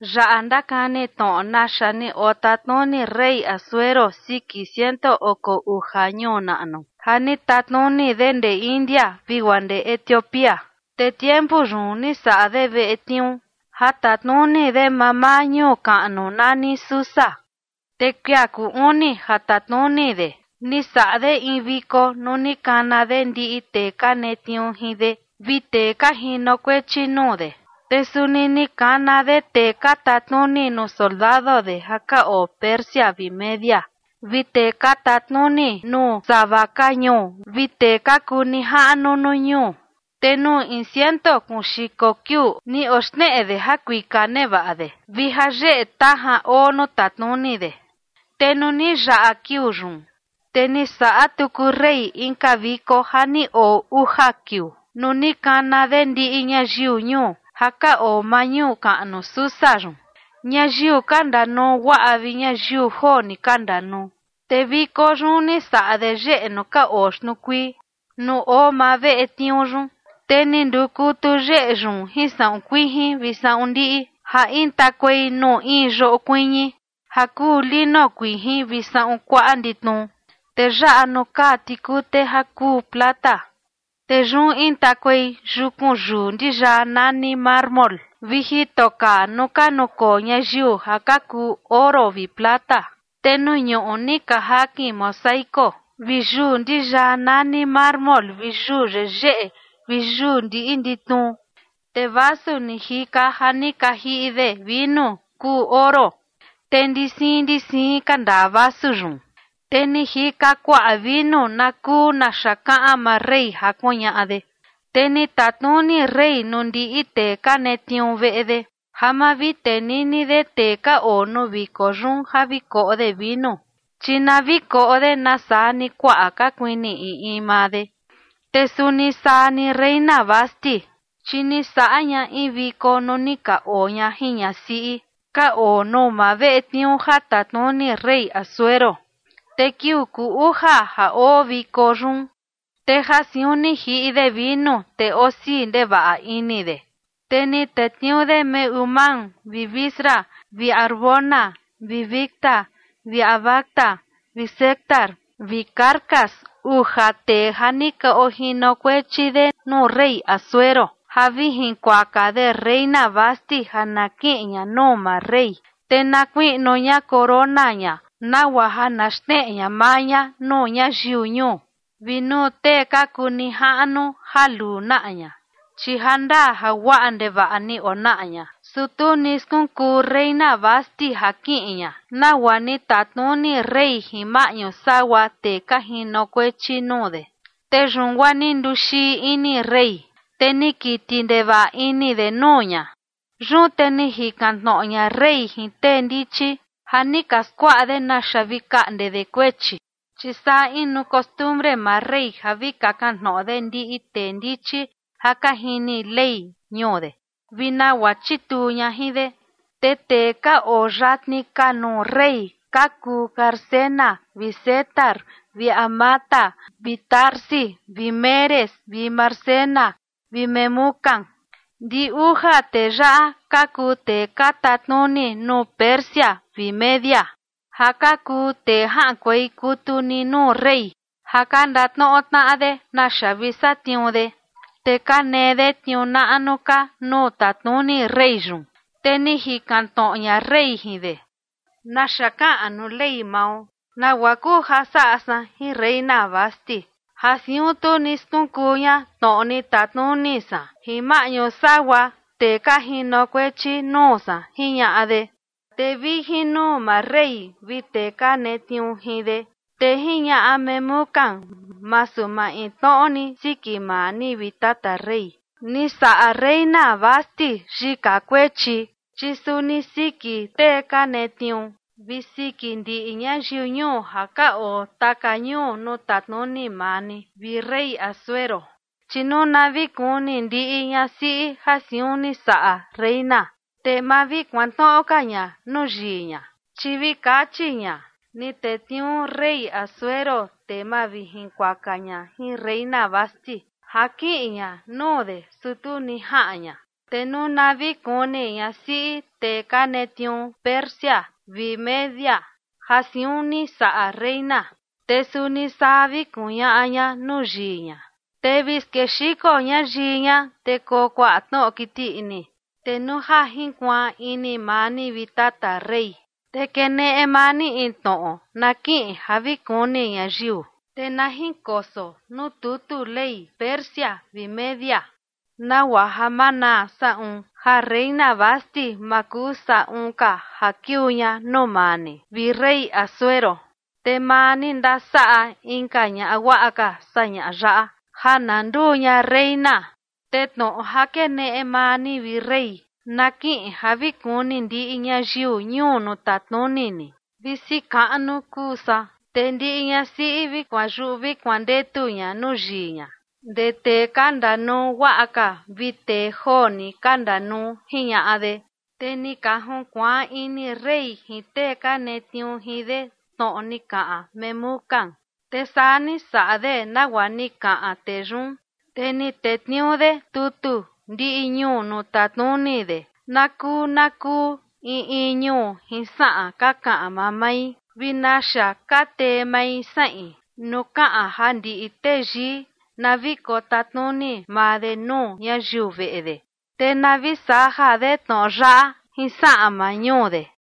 Yaꞌa ndakani tnoꞌo naxa ni otatnuni rey Asuero siki ciento oko uja ñuu naꞌnu, ja ni tatnuni de ndee India vi guaa ndee Etiopía. Te tiempu yun ni saꞌa de veꞌe tniuu ja tatnuni de mamaa ñuu kaꞌnu nani Susa. Te kuia kuu uni ja tatnuni de, ni saꞌa de in viko nuu ni kana de ndiꞌi tee ka netniuu jin de vi tee ka jinokuechi nuu de, te suni ni kana de tee ka tatnuni nuu soldado de ja ka oo Persia vi Media vi tee ka tatnuni nuu sava ka ñuu vi tee ka kuu nijaꞌnu nuu ñuu. Te nuu in ciento kuun xiko kiuu ni oxneꞌe de jakuika nevaꞌa de vi jayeꞌe tajan oo nuu tatnuni de. Te nuu ni yaꞌa kiuu yun, te ni saꞌa tuku rey inka viko ja ni oo uja kiuu, nuu ni kana de ndiꞌi ñayiu ñuu ja ka oo maa ñuu kaꞌnu Susa yun, ñayiu ka ndanuu guaꞌa vi ñayiu joo ni ka ndanuu. Te viko yun ni saꞌa de yeꞌe nuu ka oo xtnuu kuii, nuu oo maa veꞌe tniuu yun. Te ni ndukutu yeꞌe yun jin saꞌun kuijin vi saꞌun ndiꞌi ja intakuei nuu in yoꞌo kuiñi ja kuu lino kuijin vi saꞌun kuaꞌa nditnu, te yaꞌa nuu kaa tikute ja kuu plata, te yun intakuei yukun yuu ndiyaa nani mármol, vi jito kaa nuu ka nukoo ñayiu ja ka kuu oro vi plata. Te nuu ñuꞌu ni ka jakin mosaico vi yuu ndiyaa nani mármol vi yuu yeyeꞌe vi yuu ndiꞌi nditnu. Te vasu ni jika ja ni ka jiꞌi de vinu kuu oro, te ndi siin ndi siin ka ndaa vasu yun, te ni jika kuaꞌa vinu na kuu naxa kaꞌan maa rey ja kuñaꞌa de. Te ni tatnuni rey nuu ndiꞌi tee ka netniuu veꞌe de ja ma vi tenini de tee ka oo nuu viko yun ja vi koꞌo de vinu, chi na vi koꞌo de nasaa ni kuaꞌa ka kuini in in maa de. Te suni saa ni reina Vasti, chi ni saꞌa ña in viko nuu ni ka oo ña jin ñasiꞌi ka oo nuu maa veꞌe tniuu ja tatnuni rey Asuero. Te kiuu kuu uja ja oo viko yun, te ja siun ni jiꞌi de vinu te osii ndevaꞌa ini de, te ni tetniuu de Mehumán vi Bizra vi Harbona vi Bigta vi Abagta vi Zetar vi Carcas, uja tee ja ni ka ojinokuechi de nuu rey Asuero, ja vi jinkuaka de reina Vasti ja na kiꞌin ña nuu maa rey, te na kuiꞌnu ña corona ña nagua ja na xneꞌe ña maa ña nuu ñayiu ñuu vi nuu tee ka kuu nijaꞌnu ja luu naꞌa ña, chi jandaa ja guaꞌa ndevaꞌa ni onaꞌa ña. Su tu ni skunkuu reina Vasti ja kiꞌin ña nagua ni tatnuni rey jin maꞌñu sagua tee ka jinokuechi nuu de, te yun guaa ni nduxii ini rey, te ni kiti ndevaꞌa ini de nuu ña. Yun te ni jikan tnoꞌo ña rey jin tee ndichi ja ni ka skuaꞌa de naxa vi kaꞌnde de kuechi, chi saa inu costumbre maa rey ja vi kakan tnoꞌo de ndiꞌi tee ndichi ja ka jini ley ñuu de, vi nagua chituu ña jin de. Te tee ka oo yatni ka nuu rey ka kuu Carsena vi Setar vi Admata vi Tarsis vi Meres vi Marsena vi Memucán. Ndi uja tee yaꞌa ka kuu tee ka tatnuni nuu Persia vi Media ja ka kuu tee jaꞌankuei kutu ni nuu rey ja ka ndatnoꞌo tnaꞌa de naxa vi satniuu de, te ka nee de tniuu naꞌnu ka nuu tatnuni rey yun. Te ni jikan tnoꞌo ña rey jin de: ―¿Naxa kaꞌan nuu ley mao? ¿Nagua kuu ja saꞌa san jin reina Vasti ja siun tu ni skunkuu ña tnoꞌo ni tatnuni san jin maꞌñu sagua tee ka jinokuechi nuu san? ―jiñaꞌa de. Te vi jin nuu maa rey vi tee ka netniuu jin de, te jiñaꞌa Memucán: ―Masu maintnoꞌo ni siki maa ni, vi tata rey, ni saꞌa reina Vasti yika kuechi, chi suni siki tee ka netniuu vi siki ndiꞌi ñayiu ñuo ja ka oo taka ñuu nuu tatnuni maa ni, vi rey Asuero. Chi nuu na vi kuni ndiꞌi ñasiꞌi ja siun ni saꞌa reina, te ma vi kuantnoꞌo ka ña nuu yii ña, chi vi kachi ña: “Ni tetniuu rey Asuero tee mavijinkuaka ña jin reina Vasti ja kiꞌin ña nuu de, su tu ni jaꞌan ña”. Te nuu na vi kuni ñasiꞌi tee ka netniuu Persia vi Media ja siun ni saꞌa reina, te suni saa vi kuñaꞌa ña nuu yii ña, te vi skexiko ña yii ña, te koo kuaꞌa tnoꞌo kiti ini. Te nuu ja jinkuaan ini maa ni, vi tata rey, te keneꞌe maa ni in tnoꞌo na kiꞌin ja vi kuni ñayiu, te na jinkoso nuu tutu ley Persia vi Media, nagua ja ma naa saꞌun ja reina Vasti ma kuu saꞌun ka ja kiuu ña nuu maa ni, vi rey Asuero. Te maa ni ndasaꞌa inka ñaꞌa guaꞌa ka saa ñaꞌa yaꞌa ja na nduu ña reina. Te tnoꞌo ja keneꞌe maa ni, vi rey, na kiꞌin ja vi kuni ndiꞌi ñayiu ñuu nuu tatnuni ni, visi kaꞌnu kuu saa, te ndiꞌi ñasiꞌi vi kuanyuꞌu vi kuandetu ña nuu yii ña, ndee tee ka ndanuu guaꞌa ka vi tee joo ni ka ndanuu ―jiñaꞌa de. Te ni ka junkuaan ini rey jin tee ka netniuu jin de tnoꞌo ni kaꞌan Memucán, te saa ni saꞌa de nagua ni kaꞌan tee yun. Te ni tetniuu de tutu ndiꞌi ñuu nuu tatnuni de na kuu na kuu in in ñuu jin saꞌan ka kaꞌan mamai vi naxa ka tee mai saꞌin, nuu kaꞌan ja ndiꞌi teyii na vi kotatnuni maa de nuu ñayiu veꞌe de. Te na vi saja de tnoꞌo yaꞌa jin saꞌan maa ñuu de.